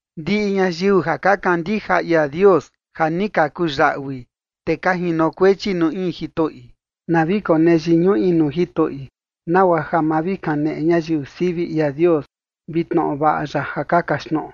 Ndiꞌi ñayiu ja ka kandija ia Dios ja ni ka kuyaꞌui, te ka jinokuechi nuu in jitoꞌi, na vi konee yiñuꞌi nuu jitoꞌi, nagua ja ma vi kaneꞌe ñayiu sivi ia Dios vi tnoꞌo vaꞌa ya ja ka kaxtnoꞌo.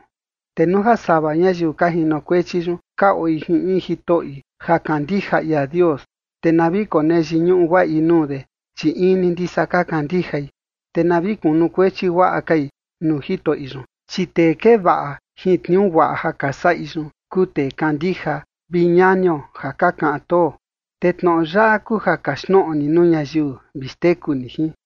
Te nuu ja sava ñayiu ka jinokuechi yun ka oi jin in jitoꞌi ja kandija ia Dios, te na vi konee yiñuꞌu guaꞌi nuu de, chi in ni ndisa ka kandijai. Te na vi kunukuechi guaꞌa kai nuu jitoꞌi yun, chi tee kee vaꞌa jin tniuu guaꞌa ja ka saꞌi yun kuu tee kandija vi ñanio ja ka kaꞌan too. Te tnoꞌo yaꞌa kuu ja kaxtnoꞌo ni nuu ñayiu vi xteku ni jin.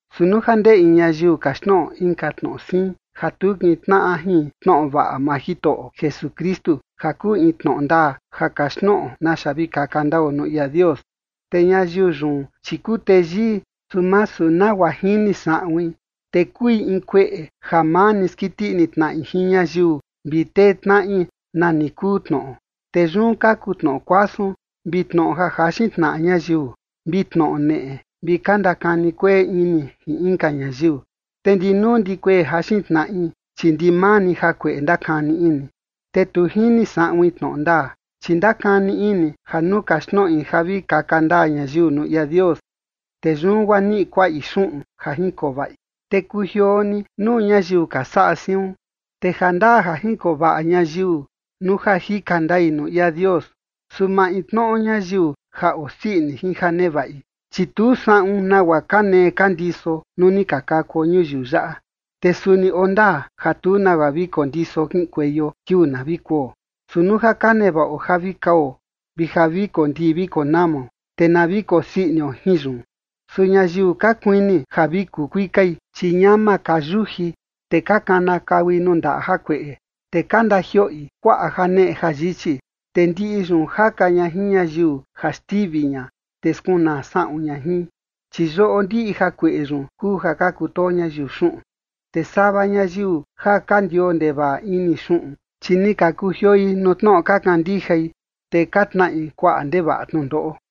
Su nuu ja ndee in ñayiu kaxtnoꞌo inka tnoꞌo siin ja tu kintnaꞌa jin tnoꞌo vaꞌa maa Jitoꞌo Jesukristu ja kuu in tnoꞌo ndaa ja kaxtnoꞌo naxa vi kaka ndao nuu ia Dios, te ñayiu yun, chi kuu teyii, su masu nagua jini saꞌuin, te kui in kueꞌe ja maa ni skiti ini tnaꞌi jin ñayiu vi tee tnaꞌi nani kuu tnoꞌo. Te yun kaku tnoꞌo kuasun, vi tnoꞌo ja jaxin tnaꞌa ñayiu, vi tnoꞌo neꞌe, vi ka ndakani kueꞌe ini jin inka ñayiu. Te ndi nuu ndi kuee jaxin tnaꞌi, chi ndimaa ni jakueꞌe ndakani ini, te tu jini saꞌuin tnoꞌo ndaa, chi ndakani ini ja nuu kaxtnoꞌi ja vi kaka ndaa ñayiu nuu ia Dios, te yun guaa niꞌi kuaꞌi xuꞌun ja jinkoo vaꞌi. Te kujioo ni nuu ñayiu ja ka saꞌa siun. Te ja ndaa ja jinkoo vaꞌa ñayiu nuu ja jika ndai nuu ia Dios, su maintnoꞌo ñayiu ja osii ini jin ja nevaꞌi. Chi tu saꞌun nagua ka nee ka ndiso nuu ni ka kakuo ñuyiu yaꞌa, te suni oo ndaa ja tu nagua vi kondiso kiꞌinkueio kiuu na vi kuo. Su nuu ja ka nevaꞌo ja vi kao vi ja vi kondii vi konamao, te na vi kosii inio jin yun. Su ñayiu ka kuini ja vi kukuikai, chi ñama ka yuji, te ka kanakaui nuu ndaꞌa jakueꞌe, te ka ndajioꞌi kuaꞌa janeꞌe jayichi, te ndiꞌi yun jaka ña jin ñayiu ja xtivi ña, te skunaa saꞌun ña jin. Chi yoꞌo ndiꞌi jakueꞌe yun kuu ja ka kutoo ñayiu xuꞌun. Te sava ñayiu ja ka ndioo ndevaꞌa ini xuꞌun, chi ni ka kujioi nuu tnoꞌo ka kandijai, te ka tnaꞌi kuaꞌa ndevaꞌa tnundoꞌo.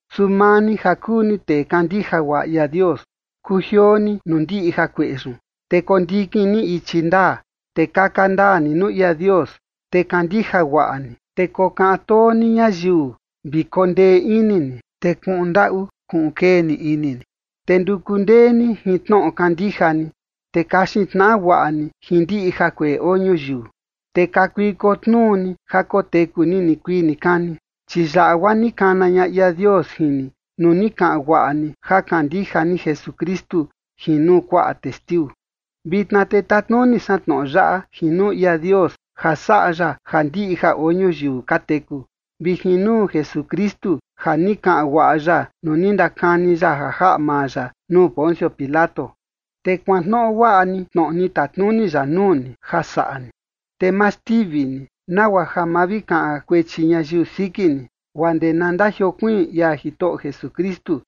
Su maa ni ja kuu ni tee kandija guaꞌa ia Dios, kujioo ni nuu ndiꞌi jakueꞌe yun, te kondikin ni ichi ndaa, te kaka ndaa ni nuu ia Dios, te kandija guaꞌa ni, te kokaꞌan too ni ñayiu vi kondee ini ni, te kuꞌun ndaꞌu kuꞌun kee ni ini ni. Te nduku ndee ni jin tnoꞌo kandija ni, te kaxin tnaꞌa guaꞌa ni jin ndiꞌi jakueꞌe oo ñuyiu, te kakuiko tnuu ni ja koteku ni nikuii nikani, chi yaꞌa guaa ni kana ña ia Dios jin ni nuu ni kaꞌan guaꞌa ni ja kandija ni Jesukristu jin nuu kuaꞌa testiu. Vitna te tatnuni san tnoꞌo yaꞌa jin nuu ia Dios ja saꞌa ya ja ndiꞌi ja oo ñuyiu ka teku, vi jin nuu Jesukristu ja ni kaꞌan guaꞌa ya nuu ni ndakani ya ja jaꞌa maa ya nuu Poncio Pilato. Te kuantnoꞌo guaꞌa ni tnoꞌo ni tatnuni ya nuu ni, ja saꞌa ni, te ma xtivi ni nagua ja ma vi kaꞌan kuechi ñayiu siki ni, guaa ndee na ndajiokuiin ia Jitoꞌo Jesukristu.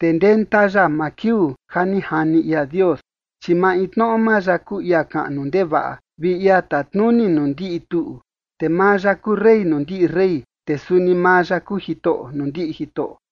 Te ndenta ya maa kiuu ja ni jani ia Dios, chi maintnoꞌo maa ya kuu ia kaꞌnu ndevaꞌa vi ia tatnuni nuu ndiꞌi tuꞌu. Te maa ya kuu Rey nuu ndiꞌi rey, te suni maa ya kuu Jitoꞌo nuu ndiꞌi jitoꞌo.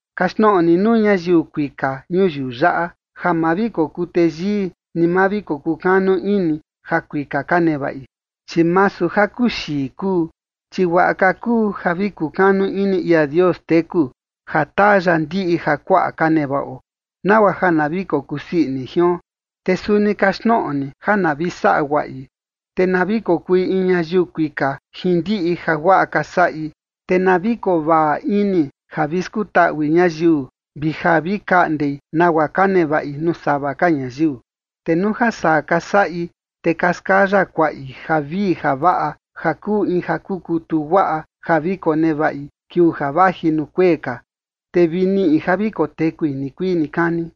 Kaxtnoꞌo ni nuu ñayiu kuika ñuyiu yaꞌa, ja ma vi kokuu teyii, ni ma vi kokukanu ini jakuika ka nevaꞌi, chi masu jakuxii kuu. Chi guaꞌa ka kuu ja vi kukanu ini ia Dios teku ja taa ya ndiꞌi jakuaꞌa ka nevaꞌo, nagua ja na vi kokusii ini jion. Te suni kaxtnoꞌo ni ja na vi saꞌa guaꞌi, te na vi kokui in ñayiu kuika jin ndiꞌi jaguaꞌa ka saꞌi, te na vi kovaꞌa ini ja vi skutaꞌui ñayiu vi ja vi kaꞌndei nagua ka nevaꞌi nuu sava ka ñayiu. Te nuu ja saa ka saꞌi, te ka skaya kuaꞌi javii javaꞌa ja kuu in ja kukutu guaꞌa ja vi konevaꞌi kiuu ja vaji nuu kuee ka, te vi niꞌi ja vi kotekui nikuii nikani.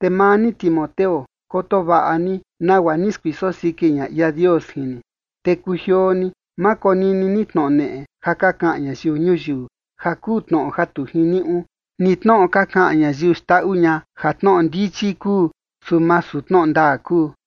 Te maa ni, Timoteo, koto vaꞌa ni nagua ni skuiso siki ña ia Dios jin ni, te kujioo ni, ma konini ni tnoꞌo neꞌe ja ka kaꞌan ñayiu ñuyiu ja kuu tnoꞌo ja tu jiniuꞌu, ni tnoꞌo ka kaꞌan ñayiu xndaꞌu ña ja tnoꞌo ndichi kuu, su masu tnoꞌo ndaa kuu.